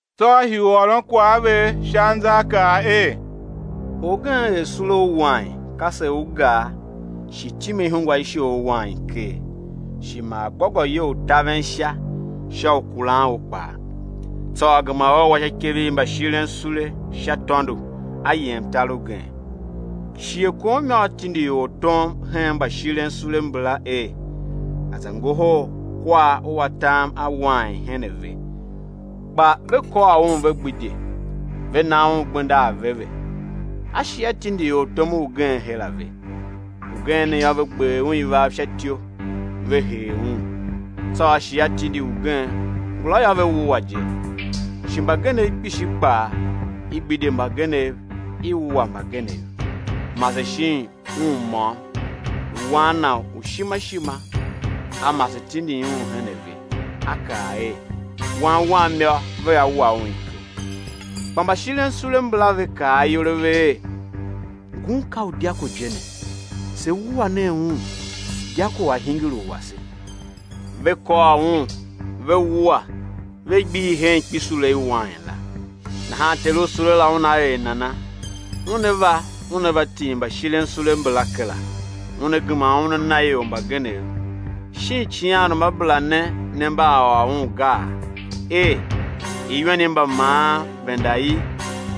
Tsô A hii u ôron kwagh a ve sha anzaakaa er: Orgen er sule u wain, kase u gar shi time ihungwa i shoghol wain ker, shi maa gôgôyou u taven sha sha u kuran u kpaa; tsô a gema u, a wa sha ikev i mbashiren sule sha tôndo, a yem tar ugen. Shighe kom yô, a tindi ortom hen mbashiren sule mbala er, a̱ za ngohol kwar u atam a wain hen ve. Kpa ve kôr un, ve gbidye, ve na un gbenda aveve. A shi A tindi ortom ugen her a ve. Ugen ne yô, ve gber un ivav sha ityou, ve hee un. Tsô shi a tindi ugen; ngula yô, ve wua je. Shi mbagenev, kpishi kpaa; i gbidye mbagenev, i wua mbagenev. Mase shin un môm, lu wan na u ishima ishima; a mase tindin un her a ve, a kaa er: Wan wam yô, vea wa un iko. Kpa mbashirensule mbala, ve kaa ayol a ve er: Ngun ka u dyako je ne, se wua nen un, dyako a̱ hingir u wase. Ve kôr un, ve wua ve gbihi hen ikpisule i wain la. Nahan ter u sule la una er nana? Una va, una va tim mbashirensule mbala kera, una gema u, una na ior mbagenev. Shin icighanruamabera ne, ne mba a ôr un gaa? er: Iwen i mbamaan venda i,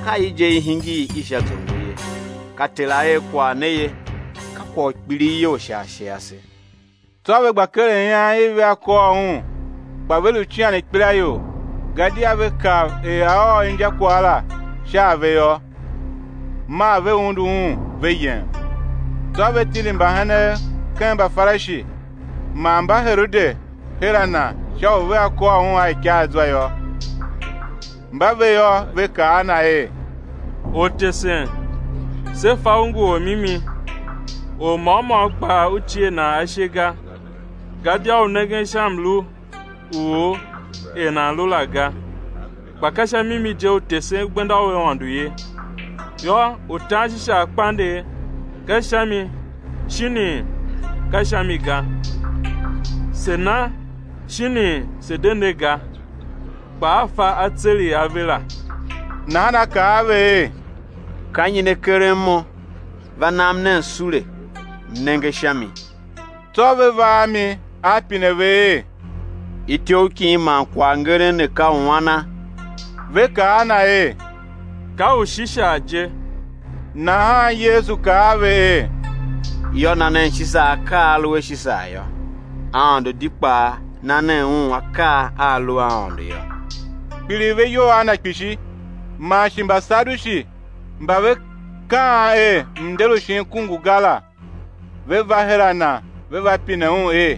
ka i je, i hingir i sha zongo ye; ka Ter A er kwagh ne ye. Ka kwagh u kpilighyol sha ashe ase. Tsô ve gba keren ian i vea kôr Un, kpa ve lu cian ikpelaior, gadia ve kav er A ôr injakwagh la sha a ve yô. Maa ve undu Un ve yem. Tsô ve tindi mbagenev ken Mbafarishi man Mbaherode her a Na sha u vea kôr Un a ikaazwa yô. Mba ve yô, ve kaa a Na er: Ortesen, se fa U ngu Or u mimi, or môm môm kpaa U cie nan ashe ga; gadia U nengen sha mlu u or er nan lu la ga, kpa ka sha mimi je U tesen gbenda u Aôndo ye. Yô, u tan Shisar kpandegh ka sha mi shinii, ka sha mi ga? Se̱ na shinii, se̱ de ne ga? Kpa A fa atseregh a ve la, nahan A kaa a ve er: Ka nyi ne karen Mo? Va nam nen sule, M nenge sha mi. Tsô ve va a mi. A pine ve er: Ityough kin man kwaghngeren ne ka u ana? Ve kaa a Na er: Ka u Shisar je. Nahan Yesu kaa a ve er: Yô, na nen Shisar akaa a a lu a Shisar yô, Aôndo di kpaa na nen Un akaa a a lu a Aôndo yô. Kpiligh ve iyol a Na kpishi. Man shi Mbasadushi mba ve kaan er mnder u shin ku ngu ga la, ve va her a Na, ve va pine Un er: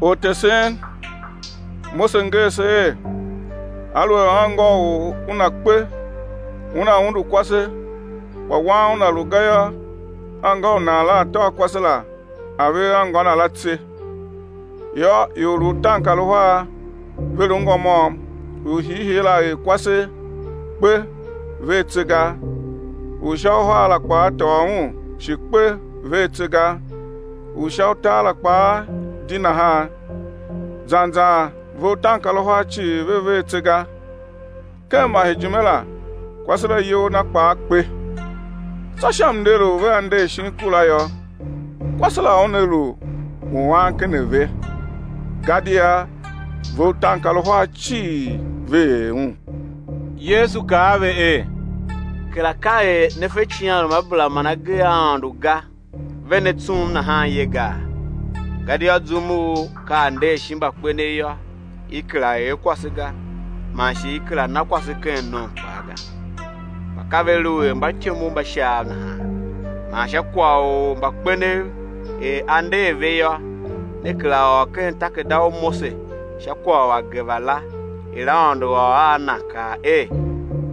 Ortesen, Mose nger se er, aluer anngô u or una kpe, una undu kwase, kpa wan una lu ga yô, anngô u nan la a̱ tôô kwase la a̱ ver anngô na la tse. Yô, ior lu utaankaruhar; ve lu ngô môm; u hiihii la er kwase, kpe, ver tse ga. U sha uhar la kpaa tôô un, shi kpe, ver tse ga; u sha utar la kpaa di nahan. Zan zan ve utaankaruhar cii ve ver tse ga. Ken masejime la, kwase la iyol na kpaa kpe. Tsô sha mnder u vea nder shin ku la yô, kwase la una lu u an ken a ve? Gadia ve utaankaruhar cii ve er un. Yesu kaa a ve er: Kera ka er ne fe icighanruamabera man agee a Aôndo ga, ve ne tsum nahan ye gaa? Gadia zum u ka a nder shin mbakpenev yô, i kera er kwase ga, man shi i kera na kwase ken nom kpaa ga, kpa ka ve lu er mbatyomov mba Shaav nahan. Man sha kwagh u mbakpenev er á nder a ve yô, ne kera ôr ken takerada u Mose sha kwagh u ageva la, er Aôndo ôr a na, kaa er: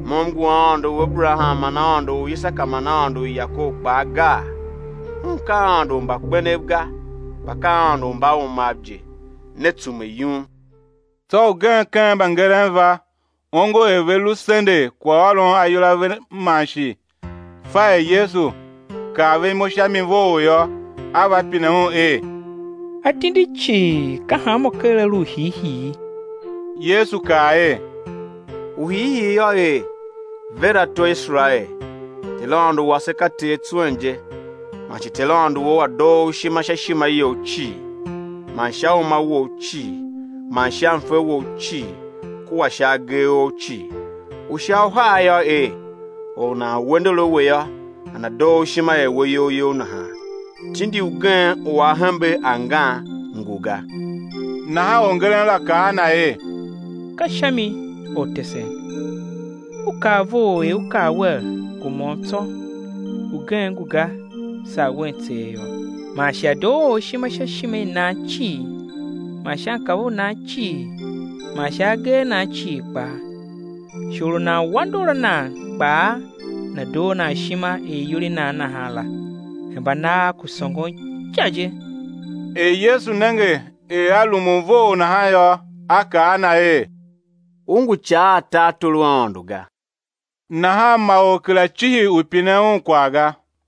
Mo m ngu Aôndo u Aberaham man Aôndo u Isaka man Aôndo u Yakob kpaa, gaa? Un ka Aôndo u mbakpenev ga, kpa ka Aôndo u mbaumav je; ne tsume yum. Tsô ugen ken mbangeren va; ongo er ve lu sendegh kwaghôron ayol a ve man shi fa er Yesu kaa ve imo sha mi vough yô, a va pine Un er: Atindi cii, ka hanmô ker a lu u hiihii? Yesu kaa er: U hiihii yô, er: Ver ato Iserael, Ter Aôndo wase ka Ter tswen je, man shi Ter Aôndo wou A̱ doo u ishima sha ishima you cii, man sha uma wou cii, man sha mfe wou cii kua sha agee ou cii. U sha uhar yô, er: Or u nan we ndor a we yô, nana̱ doo u ishima er we iyol you nahan. Tindi ugen u a hembe angan, ngu ga. Nahan orngeren la kaa a Na er: Ka sha mi, Ortesen, U kaa vough er U kaa Wer, ngu môm tsô, ugen ngu ga, saa Un tseegh yô. Man shi A̱ doo or ishima sha ishima i nan cii man sha mkav u nan cii man sha agee a nan cii kpaa. Shi or u nan we ndor a nan kpaa, nana̱ doo nan ishima er iyol i nan nahan la, hemba nagh ku sôngon ica je. Er Yesu nenge er a rumun vough nahan yô, A kaa a na er: U ngu ica a tartor u Aôndo ga. Nahan ma or kera cihi u pinen Un kwagh ga.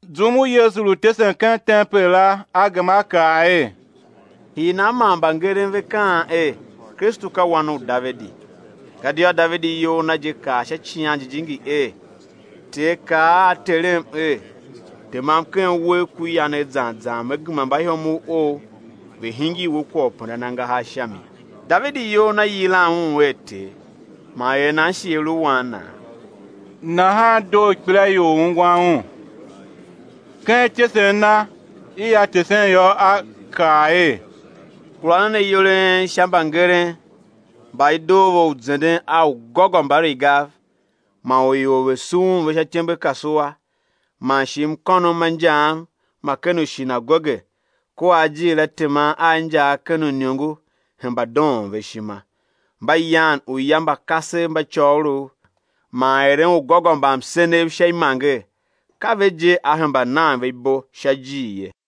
Zum u Yesu lu tesen ken tempel la, A gema A kaa er: Hii nan man mbangeren ve kaan er: Kristu ka Wan u Davidi? Gadia Davidi iyol na je kaa sha Icighan Jijingi er: Ter kaa a Terem er: Temam ken uwegh ku yanegh zan zan Me gema mbaihomov Ou ve̱ hingir We kwagh u pendan angahar sha mi. Davidi iyol na yilan Un er Ter, man er nan shi A lu Wan Naa? Nahan doo ikpelaior u ungwan Un. Ken ityesen na i A tesen yô, A kaa er: Kura nen ayol a en sha mbangeren, mba i doo ve u zenden a ugôgômbarigav man u ior ve̱ sughun ve sha ityembekasua, man shi mkônom ma injaam ma ken ushinagoge kua ajiir a teman a injaa ken uiniongo hemba doon ve ishima; mba yan uya mba kasev mba côgholov, man eren ugôgômbamsenev sha imanger, ka ve je á hemba nan ve ibo sha ijir ye.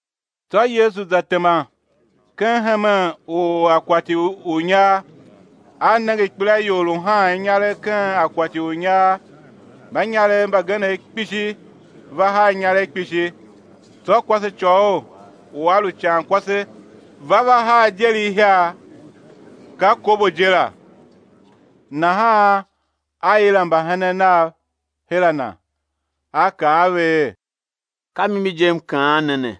Tsô Yesu za tema ken hemen u akwati u inyar. A nenge ikpelaior lu haan inyaregh ken akwati u inyar; mbanyarev mbagenev kpishi va haa inyaregh kpishi. Tsô kwasecôghol u a lu icankwase va, va haa ideri ihiar, ka kobo je la. Nahan A yila mbahenen Nav her a Na, A kaa a ve er: Ka mimi je, M kaan ne ne,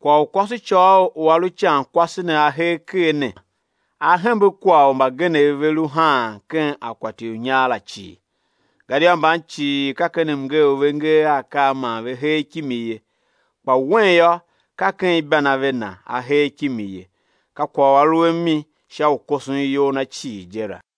kwagh u kwasecôghol u a lu icankwase ne a hee ker ne a hembe kwagh u mbagenev ve lu haan ken akwati u inyar la cii. Gadia mban cii ka ken mngee u ve ngee a akaa man ve hee kimi ye, kpa wen yô, ka ken ibanave na a hee kimi ye, ka kwagh u a lu a mi sha u koson iyol na cii je la.